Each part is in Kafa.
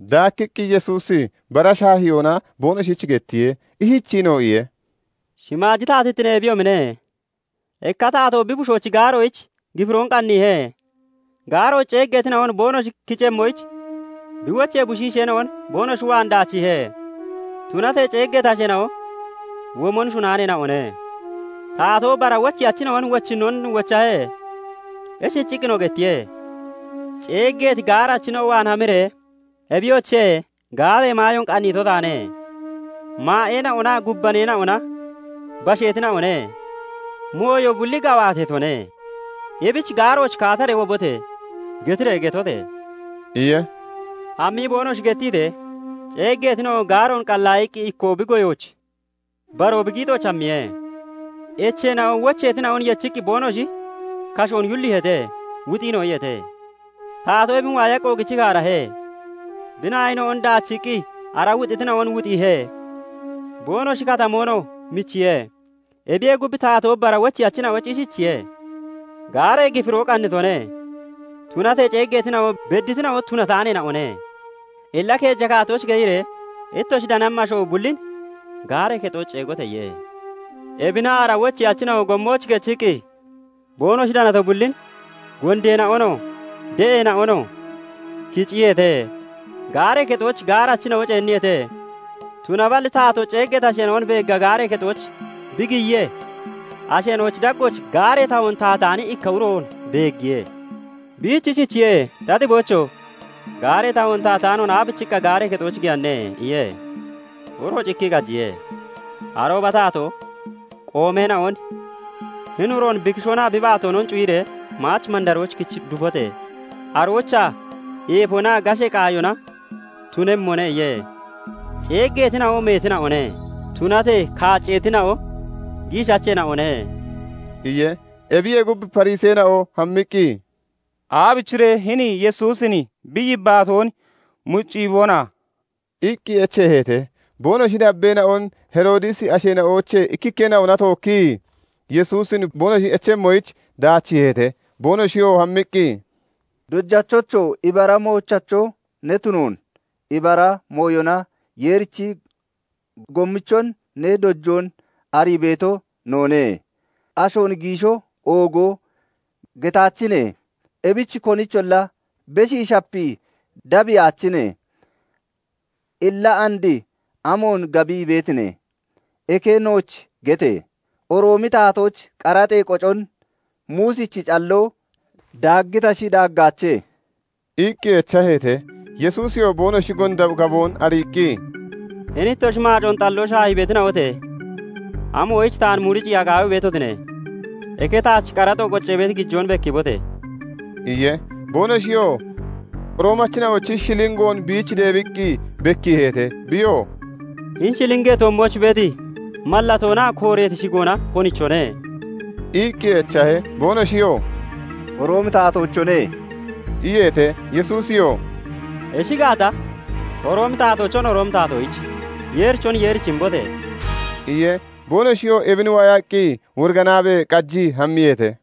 Daakkiqqi Yesuusi bara shaahiyoona boonoshich gettiye; ishichiinoo iye:- "Shimaaji taatittine ebiyoomine; ikka taatoo bi bushoochi gaaroyich gifiroon qanniihe. Gaarooch ceeggeetina'on boonoshi kicemmoyich bi wochee bushiisheena'on boonoshi waan daachiihe; tunatee ceeggeeti asheena'o womon shunaaneena'one. "Taatoo bara wocheyachina'on wochinnoon wochahe; ishichiqqinoo gettiye:- 'Ceeggeeti gaarachina'o waan hamiree, "Ebiyoche! Gaaree maayoon qanniito taane; maa'eena'onaa gubbaneena'ona basheetina'one; mooyo bulli gawaateetone; ebichi gaarooch kaataree wobote!" getiree getote!' iye. "Hammii boonoshi gettitee, ceeggeetina'o gaaroon qallaayiqqi ikkoo bi goyooch, baroo bi giixooch hammiye. Echeena'o wocheetina'on yechiqqi boonoshi kashoon yulliiheete; wuxiinoo iyeete. Taatoo ebin waayaqqi oogichii kaarahe; bi naayina'on daachiiqqi ara wuxitina'on wuxiihe; boonoshi katmoonoo michiihe. "Ebiyee gub, taatoo bara wocheyachina'oyich ishichiye:- 'Gaaree gifiro qannitone; tunatee ceeggeetina'o bedditina'o tunataaneena'one. Illa keeja kaattooch keyiree ittoshi danammi asho bullin gaaree kexooch ceegote!' iye. Ebina ara wocheyachina'o gommooch kechiqqi boonoshi danato bullin, gondeena'onoo, de'eena'onoo kiciyeete; gaaree kexooch gaarachina'o ceenniyeete. "Tunaballi taatoo ceeggeeti asheena'on beegga gaaree kexooch bi giyiyee, asheena'ochi daggooch gaaree tahoon tahataani ikka uroon beeggiye. Biich ishichiye:- 'Ta xiboocho! Gaaree tahoon tahataanoon aabichiqqa gaaree kexooch giyanne?' iye. Uroo cikkii qajiye. "Arooba taatoo qoomeena'on 'Hini uroon bi kishoonaa bi baatoonon cuyiree maach mandarooch kich dufote! Aroochaa eefonaa gashee qaayona tunemmone' iye. "Ceeggeetina'o meetina'one; tunatee kaacceetina'o giishacheena'one" iye. Ebiyee gub, Fariseena'o hammiqqi, "Aabichiree hini Yesuusin bi yibbaatoon muciyiibona?" iqqi echeeheete. Boonoshi dabbeena'on, Heroodisi asheena'oochee ikkikkeena'ona tookkii Yesuusin boonoshi echemmoyich daachiiheete; boonoshiyoo hammiqqi, "Dojachocho! Ibara moochacho ne tunoon, ibara mooyona Yeerichi gommichon ne dojoon arii beeto noone. Ashoon giisho, oogo getaachine; ebichi konicholla beshii shapii dabbiyaachine. Illa and amoon gabii beetine? Eke nooch gete! Roomi taatoyich qaraxee qocon Muusichi calloo daaggitashi, daaggaache?" iqqi echaheete. Yesuusiyoo boonoshi gonda gaboon ariiqqi, "Hini ittoshi maacoon xalloo shaahii beetina'ote! Amoyich taan muciyiiya qaawii beetotine? Eke taach qaraxo qoccee beeti gijoon bekkiibote!" iye. Boonoshiyoo Roomachina'ochi shilingoon biich deebiqqi bekkiiheete. Biyoo "Hini shilingee toommooch beeti mallatoonaa kooreeti shigoona konichone?" iqqi echahe. Boonoshiyoo "Roomi taatoochone" iyeete. Yesuusiyoo "Ishi gaata, Roomi taatoochon Roomi taatoyich, Yeerichon Yeerichi imbote!" iye. Boonoshiyoo ebin waayaqqi woriganaabee qajii hammiyeete.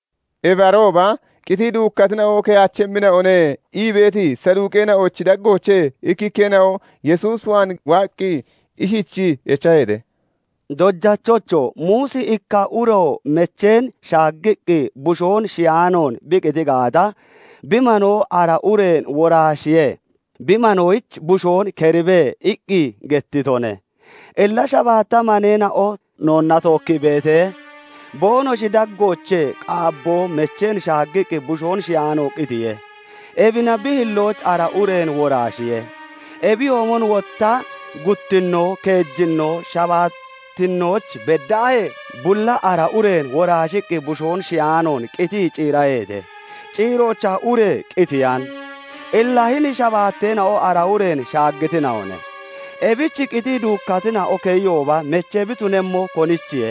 Ebi arooba "Qitii duukkatina'o keyaachemmina'one" ii beeti Saduuqeena'ochi daggoochee ikkikkeena'o Yesuus waan waaqqi ishichii echaheete; "Dojachocho! Muusi 'Ikka uro mecheen shaaggiqqi bushoon shiyaanoon bi qiti gaata, bi manoo ara ureen woraashiree bi manoyich bushoon keribe' iqqi gettitone. Illa shabaatta maneena'o noonna tookkii beetee, boonoshi daggoochee qaabboo mecheen shaaggiqqi bushoon shiyaanoon qitiye. Ebina bi hilloo ara ureen woraashiye; Ebiyoomon wotta guttinno, keejinno, shabaattinnooch beddaahee bulli ara ureen woraashiqqi bushoon shiyaanoon qitii ciiraheete. Ciiroochaa ure qitiyan. Illa hini shabaatteena'o ara ureen shaaggitina'one. Ebich qitii duukkatina'o keyiyooba mechee bi tunemmo konichiye?"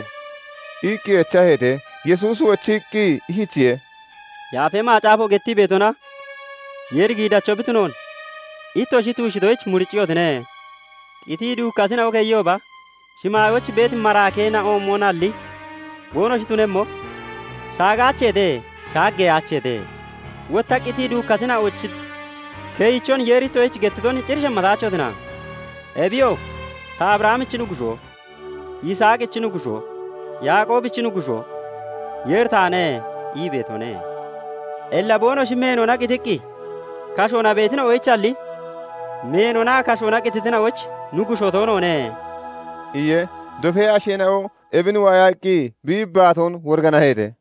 iqqi echaheete. Yesuusi wochiqqi ishichiye:- "Yaafa Macaafo gettii beetonaa Yeeri giidacho bi tunoonon ittoshi tuushitoyich muricciyotine. Qitii duukkatina'o keyiyooba, shimaayooch beeti maraakeena'oomonalli boonoshi tunemmo; shaagaacheete; shaaggeyaacheete. Wotta qitii duukkatina'ochi keyichon Yeeri ittoshich gettiton cir shemmataachotina? Ebiyoo 'Ta Abrahamichi Nuggushoo, Yisaaqichi Nuggushoo, Yaaqoobichi Nuggushoo Yeeri taane' ii beetone. Illa boonoshi meenona qitiqqi kashoona beetina'oyichalli meenonaa kashoona qititina'oyich Nuggushoo toonoone" iye. Dofee asheena'o ebin waayaqqi bi yibbaatoon woriganaheete.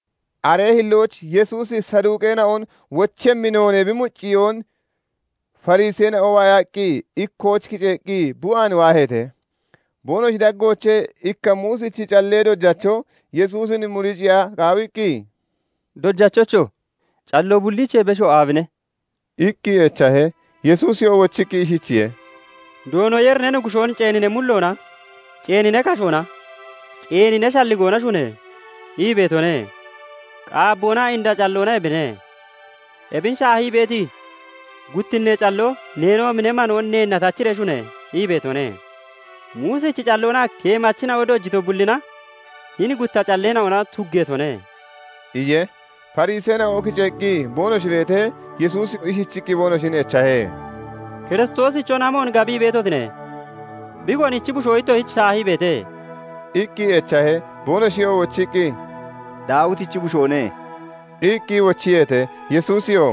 Aree hillooch Yesuusi Saduuqeena'on wochemmi noonee bi mucciyoon Fariseena'o waayaqqi ikkooch kiceeqqi bi waan waaheete. Boonoshi daggoochee ikka Muusichi callee dojacho Yesuusin muriciya qaawiqqi, "Dojachocho! Calloo bulliichee besho aabine?" iqqi echahe. Yesuusiyoo wochiqqi ishichiye:- "Doono Yeeri ne Nuggushoon ceeni ne mulloona, ceeni ne kashoona, ceeni ne shalligoona shune!' ii beetone. Qaabboonaa inda calloona ebine. Ebin shaahii beeti guttinnee calloo 'Neenoomi ne manoon neenna tachiree shune!' ii beetone. Muusichi calloonaa keemachina'o dojito bullina hini gutta calleena'ona tuggeetone" iye. Fariseena'o kiceeqqi boonoshi beetee, Yesuusi ishichiqqi boonoshin echahe; "Kiristoosichon amoon gabii beetotine? Bi konichi bushoo ittoshich shaahii beete?" iqqi echahe. Boonoshi wochiqqi, "Daawitichi bushoone" iqqi wochiyeete. Yesuusiyoo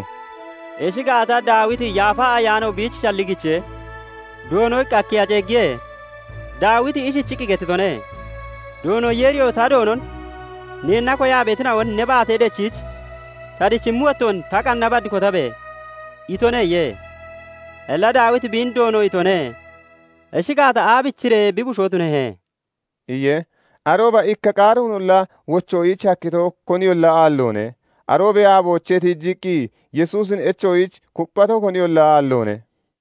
"Ishi gaata, Daawiti Yaafa Ayaano biich shalligichee, 'Doono' iqqi akkiya ceeggiye? Daawiti ishichiqqi gettitone; 'Doono Yeeriyoo ta Doonon "Neenna koyaa beetina'on ne baate dechiich ta dichimmi wottoon ta qanna bad kotabe!" itone' iye. Illa Daawiti biin 'Doono' itone. Ishi gaata, aabichiree bi bushoo tunehe?" iye. Arooba ikka qaaroonolla wochoyich hakkito koniyolla aalloone. Aroobee aaboochee tiijiqqi Yesuusin echoyich kupphato koniyolla aalloone.